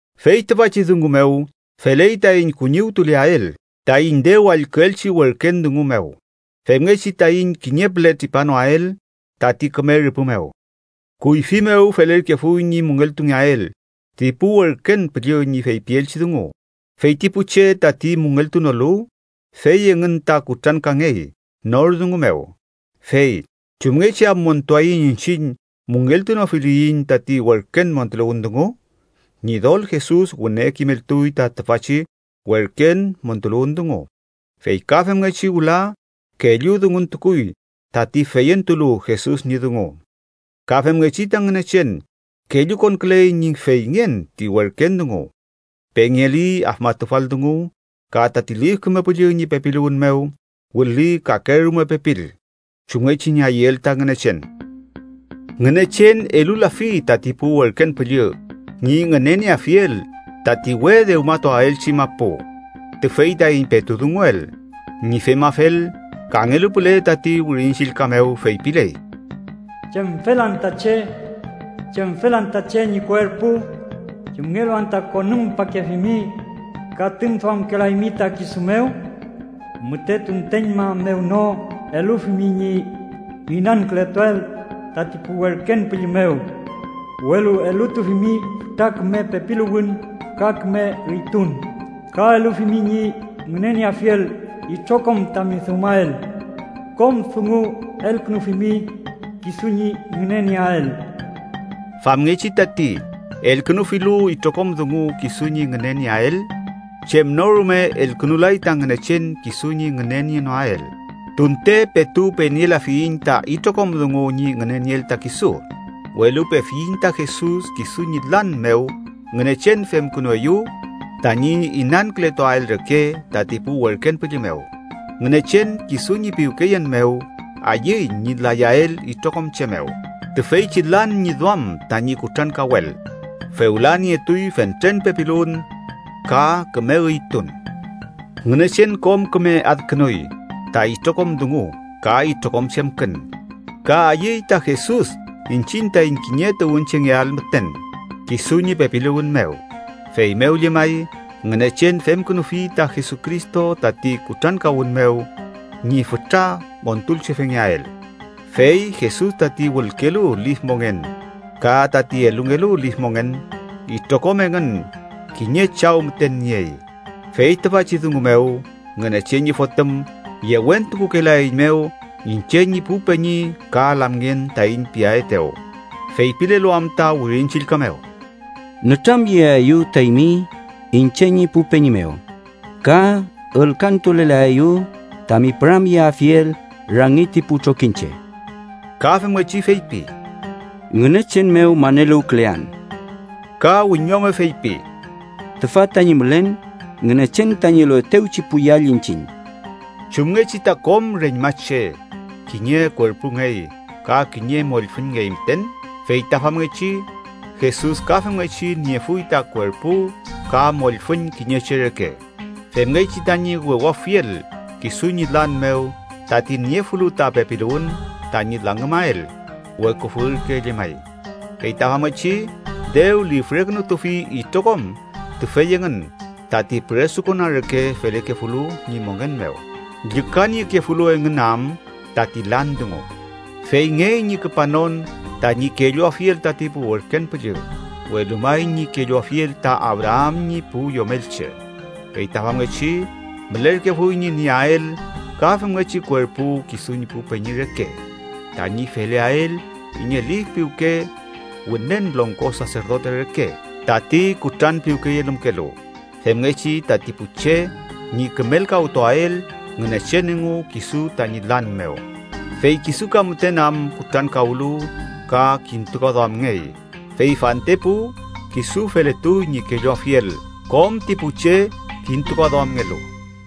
Fey tüfachi dungu mew, feley taiñ kuñiwtuleael taiñ dew allküelchi werken dungu mew, femngechi taiñ kiñe püle tripanoael tati küme rüpü mew. Kuyfi mew felerkefuy ñi müngeltungeael ti pu werken püllü ñi feypielchi dungu, fey ti pu che tati müngeltunolu fey engün ta kutrankangey nor dungu mew. Fey ¿chumngechi am montuaiñ iñchiñ müngeltunofiliyiñ tati werken montuluwün dungu? Ñidol Jesus wüne kimeltuy ta tüfachi werken montuluwün dungu, fey ka femngechi wüla kellu dunguntukuy tati feyentulu Jesus ñi dungu. Ka femngechi ta Ngünechen kellukonküley ñi feyngen ti werken dungu, pengeli afmatufal dungu, ka tati Lif Küme Püllü ñi pepiluwün mew wüli kakerume pepil, chumngechi ñi ayüel ta Ngünechen. Ngünechen elulafi tati pu werken püllü ñi ngünenieafiel tati we dewmatuaelchi mapu tüfey taiñ petu dunguel. Ñi femafel, kangelu püle tati Wirin Chillka mew feypiley: “¿Chemfel anta che? ¿Chemfel anta che ñi kuerpu? ¿Chumngelu anta konümpakefimi ka tüngduamkelaymi ta kisu mew? Müte tunteñma mew no elufimi ñi inankületuael tati pu werken püllü mew, welu elutufimi fütra küme pepiluwün ka küme üytun. Ka elufimi ñi ngünenieafiel itrokom tami dewmael. Kom dungu elkünufimi kisu ñi ngünenieael.” Famngechi tati, elkünufilu itrokom dungu kisu ñi ngünenieael, chem no rume elkünulay ta Ngünechen kisu ñi ngünenienoael. Tunte petu penielafiyiñ ta itrokom dungu ñi ngünenieel ta kisu, welu pefiyiñ ta Jesus. Kisu ñi lan mew Ngünechen femkünueyew tañi inankületuael reke tati pu werken püllü mew. Ngünechen, kisu ñi piwkeyen mew, ayüy ñi layael itrokom che mew. Tüfeychi lan ñi duam tañi kutrankawel, fewla nietuy fentren pepiluwün ka küme üytun. Ngünechen kom küme adkünuy ta itrokom dungu ka itrokom chemkün, ka ayüy ta Jesus iñchiñ taiñ kiñe tuwünchengeael müten kisu ñi pepiluwün mew. Feymew llemay, Ngünechen femkünufi ta Jesucristo tati kutrankawün mew ñi fütra Montulchefengeael. Fey Jesus tati wülkelu lif mongen ka tati elungelu lif mongen, itrokom engün kiñe Chaw müten niey. Fey tüfachi dungu mew, Ngünechen ñi Fotüm yewentukukelaeiñmew iñche ñi pu peñi ka lamngen taiñ piaetew. Feypilelu am ta Wirin Chillka mew: “Nütramyeaeyu ta eymi iñche ñi pu peñi mew, ka ülkantulelaeyu tami püramyeafiel rangi ti pu trokiñche.” Ka femngechi feypi: “Ngünechen mew maneluwkülean.” Ka wiñome feypi: “Tüfa tañi mülen, Ngünechen tañi eluetewchi pu yall iñchiñ.” Chumngechi ta kom reñmache kiñe kuerpungey ka kiñe mollfüñngey müten, fey ta famngechi Jesus ka femngechi niefuy ta kuerpu ka mollfüñ kiñe che reke, femngechi tañi wewafiel kisu ñi lan mew tati niefulu ta pepiluwün tañi langümael, weküfü ürke llemay. Fey ta famngechi dew lifrekünutufi itrokom tüfey engün tati püresukona reke felekefulu ñi mongen mew, llükaniekefulu engün am tati lan dungu. Feyngey ñi küpanon tañi kelluafiel tati pu werken püllü, welu may ñi kelluafiel ta Abraam ñi pu yomelche. Fey ta famngechi mülerkefuy ñi nieael ka femngechi kuerpu kisu ñi pu peñi reke, tañi feleael kiñe lif piwke Wünen Longko Saserdote reke tati kutranpiwkeyelümkelu, femngechi tati pu che ñi kümelkawtuael Ngünechen engu kisu tañi lan mew. Fey kisu ka müten am kutrankawlu ka kintukaduamngey, fey fantepu kisu feletuy ñi kelluafiel kom ti pu che kintukaduamngelu.